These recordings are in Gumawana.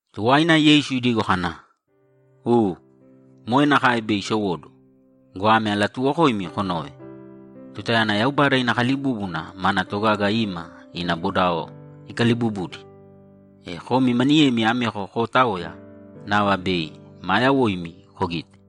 Tuwaina Yeisu idigo kana, ‘U, moe nakae bei isowóduwo go, ame alatuuwokoimi konōve: Tutayana Yaubada ina kalibúbuna mana togaga ima ina bodao ikaliibubudi, e komi maniyemi ameko kootaoya, nava bei maa yawoimi kogite.’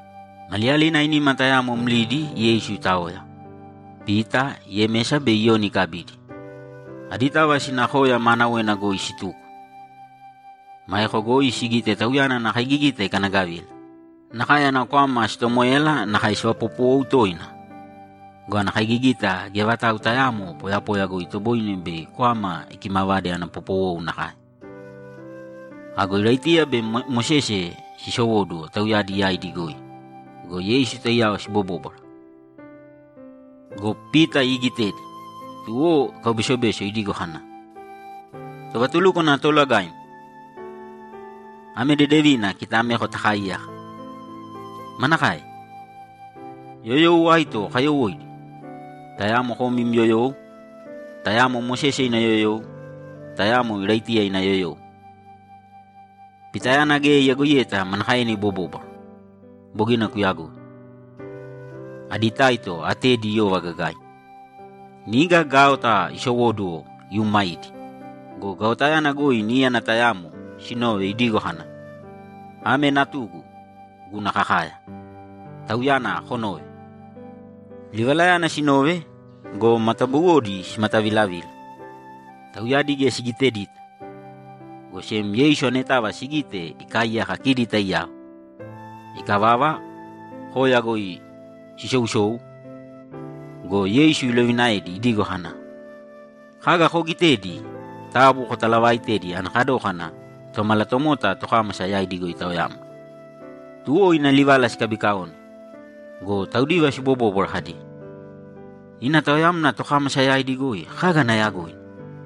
Maliyalina ainima tayamo mlidi Yeisu itaoya, Pita, Yemesa be Iyoni ikabidi, aditava sina koya maanawena goi situko. Maeko goi sigite Tauyana ana kaigigita ikanagavila, nakae ana kwama sitomoéyala nakae sivapopowou toina go, ana kaigigita geya vatau tayaamo poyapoya goi itoboine bei kwama ikimavade ana popowou nakae. Ago Iraitiya be Mosese sisowóduwo tauyadi yaidi goi go, Yeisu taiyao sibobóbwara. Go Pita iigitedi, tuwo ikaubesobeso idigo kana, ‘Tovatulúkwana Toolagaim, ame dedevina kita ameko takaaiyaka. Manakae? Yoyou aito kayowóidi? Tayamo kom im yoyou, tayamo Mosese ina yoyou, tayamo Iraitiya ina yoyou.’ Pitayana geya iyagoiyeta manakaena ibobóbwara. Bogina kuyagoi. Adi taito atedi iyova gagaina. Niga gaota isowóduwo iumaidi go, gaotayana goi níyana tayamo sinove, idigo kana, ‘Ame Natugu, guna kakaya. Tauyana konōve!’ Livalayana sinove go, matabuwodi simatavilavila, tauyadi geya sigitedita, go sem Yeisu anetava sigite ikaaiyaka kidi taiyao. Ikavava, koya goi sisousou go, Yeisu ilovinaedi idigo kana, ‘Kaga koogitedi taabu kotalaavaitēdi ana kadókana Tomalatomota tokámasa yaidi goi itaoyamna.’ Tuwo ina livala sikabikaone go, taudiva sibobóbwara kadi, ‘Ina taoyamna tokámasa yaidi goi kaga ana yagoina?’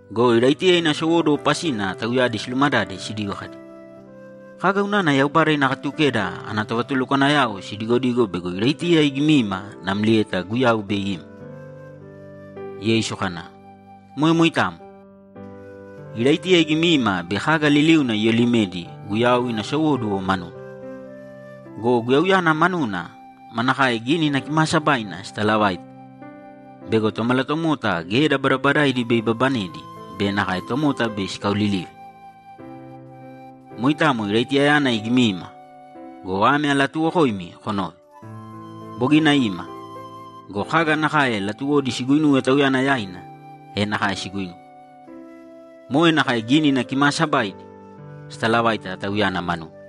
Go Iraitiya ina sowóduwo pasina tauyadi silumadade sidigo kadi, ‘Kaga unana Yaubada ina Katukeda ana tovatulukwanayao sidigodigo bego Iraitiya igimiima namlieta Guyau bei ima?’ Yeisu kana, ‘Moe moitamo. Iraitiya igimiima bei kaga liliuna iyolimedi Guyau ina sowóduwo manuna. Go Guyauyana manuna manakae Gínina Kimaasabaidi sitalavaita bego Tomalatomota geda badabadaidi bei ibabanedi be nakae tomota bei sikaolilive? Moitamo Iraitiyayana igimiima go, ame alatuuwokoimi konōve: Bogina ima go, kaga nakae latuwodi siguinuwe tauyana yaina, e nakae siguinuwe. Moe nakae Gínina Kimaasabaidi sitalavaita tauyana manuna.’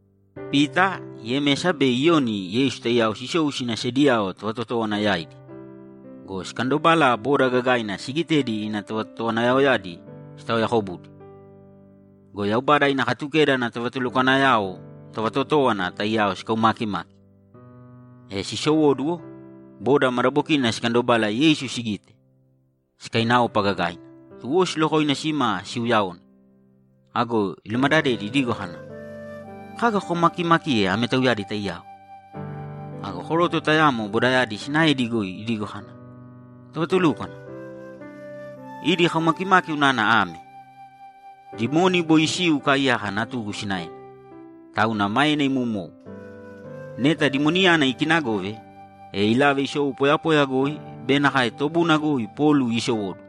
Pita, Yemesa be Iyoni Yeisu taiyao sisou sina sediyao tovatotówana yaidi go, sikandobala boda gagaina sigitedi ina tovatotowanayaoyadi sitaoyakobudi go, Yaubada ina Katukeda ana tovatulukwanayao tovatotówana taiyao sikaumaakimaki. E sisowóduwo, boda madabokina sikandobala Yeisu sigite, sikainaopa gagaina, tuwo silokoina sima siuyaone. Ago ilumadadedi idigo kana, ‘Kaga kokaumakiimakiye ame tauyadi taiyao?’ Ago koroto tayamo bodayadi sinaedi goi idigo kana, ‘Tovatulúkwana, idi kaumakimaki unana ame: Dimoni boi isiu ikaaiyaka natugu sinaena, tauna maena imoumou. Neta dimoniyana ikiinagove, e ilave isou poyapoya goi be nakae tobuna goi polu iisowóduwo.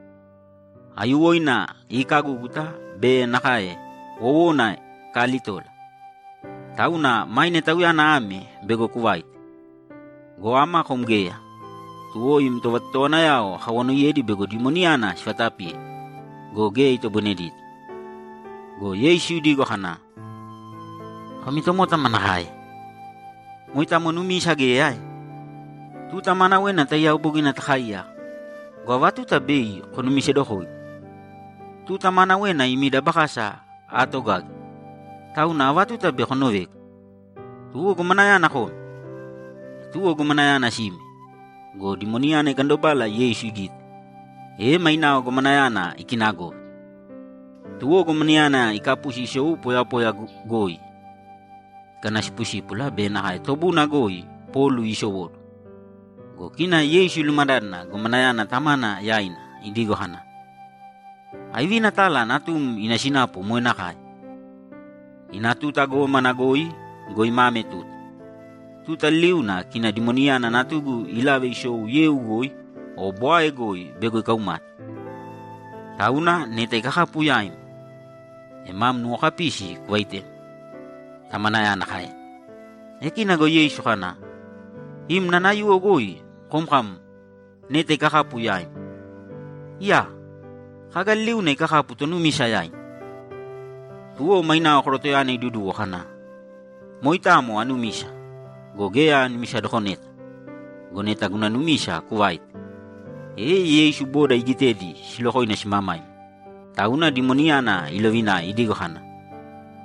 Aiyuwoina iikagúguta be nakae wowona ikaalitola. Tauna maine tauyana ame bego kuvaite. Go ama, kom geya, tuwo im tovatotowanayao akawanoiyedi bego dimoniyana sivatapiye go, geya itoboinedita.’ Go Yeisu idigo kana, ‘Komi tomota manakae? Moitamo numisa geya ae? Tuta maanawena taiyao bogina takaaiyaka go, ava tuta bei konumisedokoigu? Tuta maanawena imi dabakasa aatogage, tauna ava tuta bei konovegu? Tuwo gomanayana kōme!’ E tuwo gomanayana sime go, dimoniyana ikandobala Yeisu igite, e mainao gomanayana ikinagove. Tuwo gomanayana ikapusi isou poyapoya goi ikanasipusípula be nakae tobuna goi polu iisowóduwo. Go kina Yeisu ilumadádana gomanayana tamana yaina idigo kana, ‘Aivina tala natum ina sinapu moe nakae?’ ‘Ina tuta gómana goi go, ima ame tuta. Tuta liliuna kina dimoniyana natugu ilave isou yeu goi o bwae goi bego ikaumate. Tauna, neta ikakapu yaim, e mam nuwokapisi kuvaitema’, tamanayana kaena. E kina go Yeisu kana, ‘Im nanayuwo goi kom kam, “Neta ikakapu yaim.” Iyaa! Kaga liliuna ikakapu tonumisa yaina.’ Tuwo mainao korotoyana iduduwo kana, ‘Moitamo anumisa go, geya anumisadokoneta. Go neta guna numisa kuvāite!’ E Yeisu boda igitedi silokoina simamaima, tauna dimoniyana ilovinae idigo kana,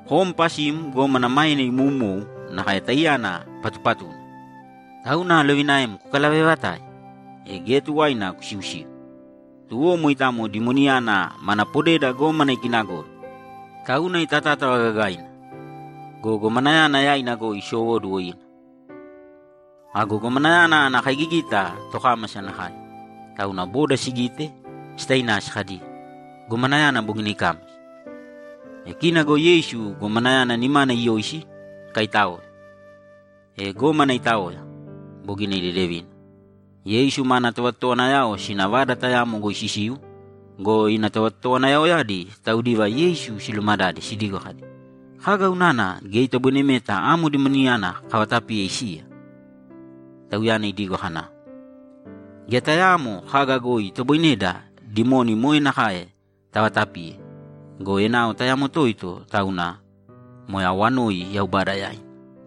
‘Kom pasim gómana maena imoumou nakae taiyana patupatuna, tauna alovinaem kukalavevatāe, e geya tuwaina kusiusīu!’ Tuwo moitamo dimoniyana mana podeda gómana ikinagove, tauna itatátava gagaina go, gomanayana yaina goi isowóduwo ina. Ago gomanayana ana kaigigita tokámasa nakae, tauna boda sigite, sitainasi kadi, ‘Gomanayana bogina ikámasa.’ E kina go Yeisu gomanayana nimana iyoisi, ikaitáoe. E gómana itaoya, bogina idedevina. Yeisu mana tovatotowanayao sina vada tayamo goi sisiu go, ina tovatotowanayaoyadi taudiva Yeisu silumadade sidigo kadi, ‘Kaga unana geya itoboinemeta amo dimoniyana kavatapiye isiya?’ Tauyana idigo kana, ‘Geya tayaamo kaga goi itoboineda dimoni moe nakae tavatapiye go, enao tayamo toito tauna, moe awanoi Yaubada yaina.’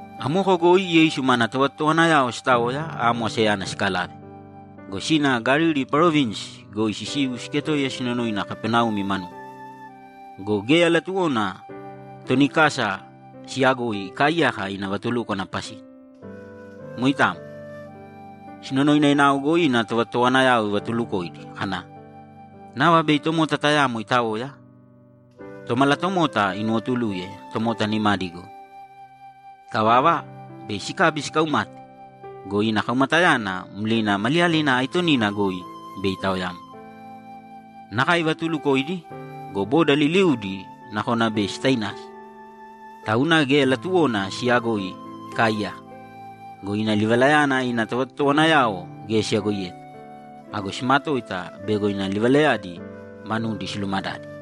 Amoko goi Yeisu mana tovatotowanayao sitaoya amo asayana sikalave go, sina Galili parovinsi goi sisiu siketoiya sinonoina Kapaneumi manuna. Go geya latuwona toni kasa siyagoi ikaaiyaka ina vatulúkwana pasina. Moitamo. Sinonoina enao goi ina tovatotowanayao ivatuulukoidi kana, ‘Nava bei tomota tayamo itaoya, Tomalatomota inuwotuluye tomota nimadi goi. Ikavava, bei sikabi sikaumate go, ina kaumatayana mlina maliyalina aitonina goi bei itaoyamna.’ Nakae ivatuulukoidi go, boda liliudi nakona bei sitainasi, tauna geya latuwona siyagoi ikaaiyaka. Go ina livalayana ina tovatotowanayao geya siyagoiyeta. Ago simatoita bego ina livalayadi manudi silumadade.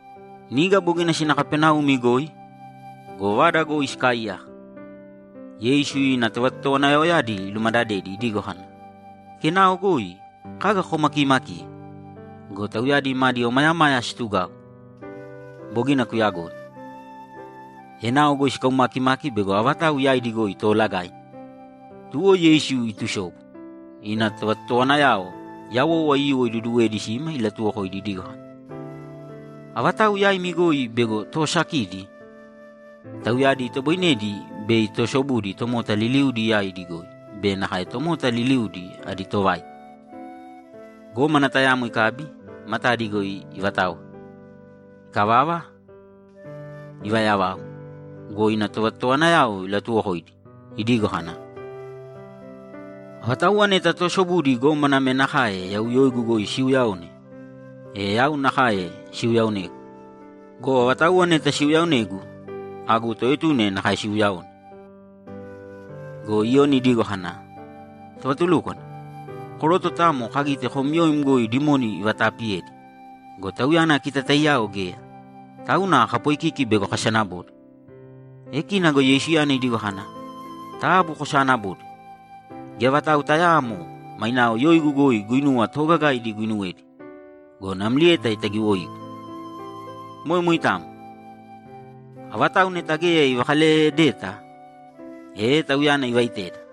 Niga bogina sina Kapaneumi goi go, vada goi sikaaiyaka, Yeisu ina tovatotowanayaoyadi ilumadadedi idigo kana, ‘Kenao goi kaga kokaumakimakiye?’ Go tauyadi madi omayamaya situgau. Bogina kuyagoi. Enao goi sikaumakimaki bego avatau yaidi goi toolagaina. Tuwo Yeisu itusobu, ina tovatotowanayao yawou aiyuwo iduduwedi sima ilatuwokoidi idigo kana, ‘Avatauwa yaimi goi bego toosakidi, tauyadi itoboinedi bei toosobudi tomota liliudi yaidi goi be nakae tomota liliudi adi tovaita.’ Gómana tayamo ikabi, matadi goi ivataoe. Ikavava, ivaayavau go, ina tovatotowanayaoyadi ilatuwokoidi idigo kana, ‘Avatauwa neta toosobudi gómana ame nakae yau yoigu goi siiuyaone, e yau nakae siuyaaonegu. Go avatauwa neta siuyaaonegu, agu toetuna nakae siiuyaone.’ Go Iyoni idigo kana, ‘Tovatulúkwana, koroto tayamo kagite kom yoim goi dimoni ivataapiyedi go, tauyana kita taiyao geya, tauna kapoikiki bego kasanabode.’ E kina go Yeisuyana idigo kana, ‘Taabu kosaanabōde. Geya vatau tayaamo mainao yoigu goi guinuwa toogagaidi iguinuwedi go, namlieta itagiwoigu. Moe moitamo. Avatau neta geya ivakaleyedeta, e tauyana ivaiteda.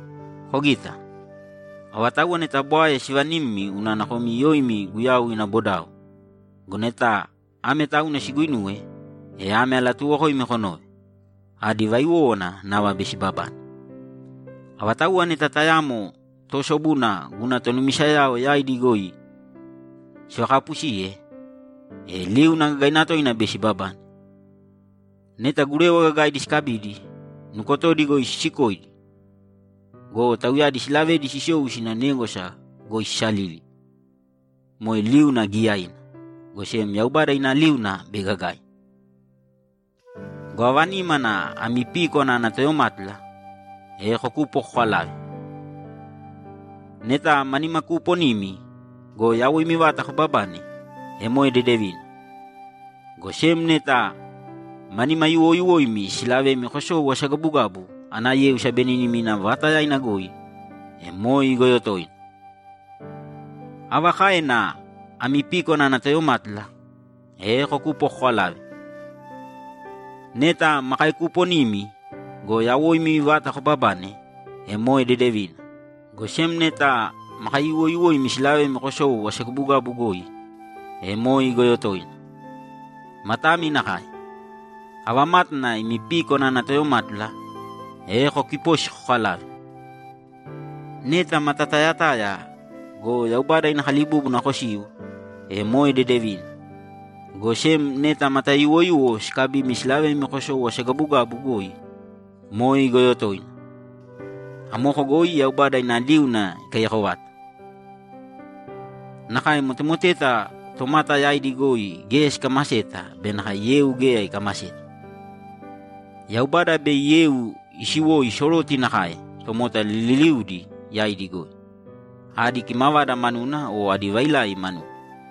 Kogita. Avatauwa neta bwae sivanimmi unana komi yoimi Guyau ina bodao go, neta ame tauna siguinuwe, e ame alatuuwokoimi konōve: Adi vaiwówana nava bei sibabane. Avatauwa neta tayamo toosobuna guna tonumisayao yaidi goi sivakapusiye, e liuna gagaina toina bei sibabane. Neta gurewa gagaidi sikabidi, nukotodi goi sisikoidi go, tauyadi silavedi sisou sina négwasa goi sisalili, moe liuna giiyaina, go sem Yaubada ina liuna bei gagaina. Go ava nímana ami píkwana ana toyomátula, e kokūpo kokalāve. Neta ma nimakuuponimi go, yawoimi vata kobabane, e moe dedevina, go sem neta ma nimayuwoyuwoimi silavemi kosou asagabugabu ana yeu sabenínima vaatayaina goi, e moe igoyo toina. Ava káena ami píkwana ana toyomátula, e kokūpo kokalāve. Neta ma kaekuuponimi go, yawoimi vata kobabane, e moe dedevina, go sem neta ma kaeyuwoyuwoimi silavemi kosou asagabugabu goi, e moe igoyo toina. Matami nakae. Ava mátana ami píkwana ana toyomátula, e kokipōsi kokalāve. Neta mata tayataya go, Yaubada ina kalibúbuna kosiu, e moe dedevina, go sem neta mata yuwoyuwo sikabimi silavemi kosou asagabugabu goi, moe igoyo toina. Amoko goi Yaubada ina liuna ikaiyako vata. Nakae motemoteta tomata yaidi goi geya sikamaseta be nakae yeu geya ikamaseta. Yaubada yeu bei isiwoi soroti nakae tomota liliudi yaidi goi, adi kimavada manuna o adi vailai manuna.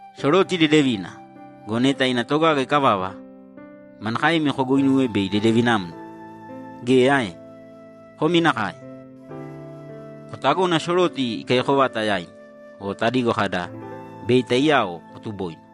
Soroti dedevina go, neta ina togaga ikavava, manakaemi koguinuwe bei idedevinamna? Geya ae? Komi nakae. Kotagōna soroti ikaiyako vata yaimi, o tadigo kada, “Bei taiyao kotuboina.”’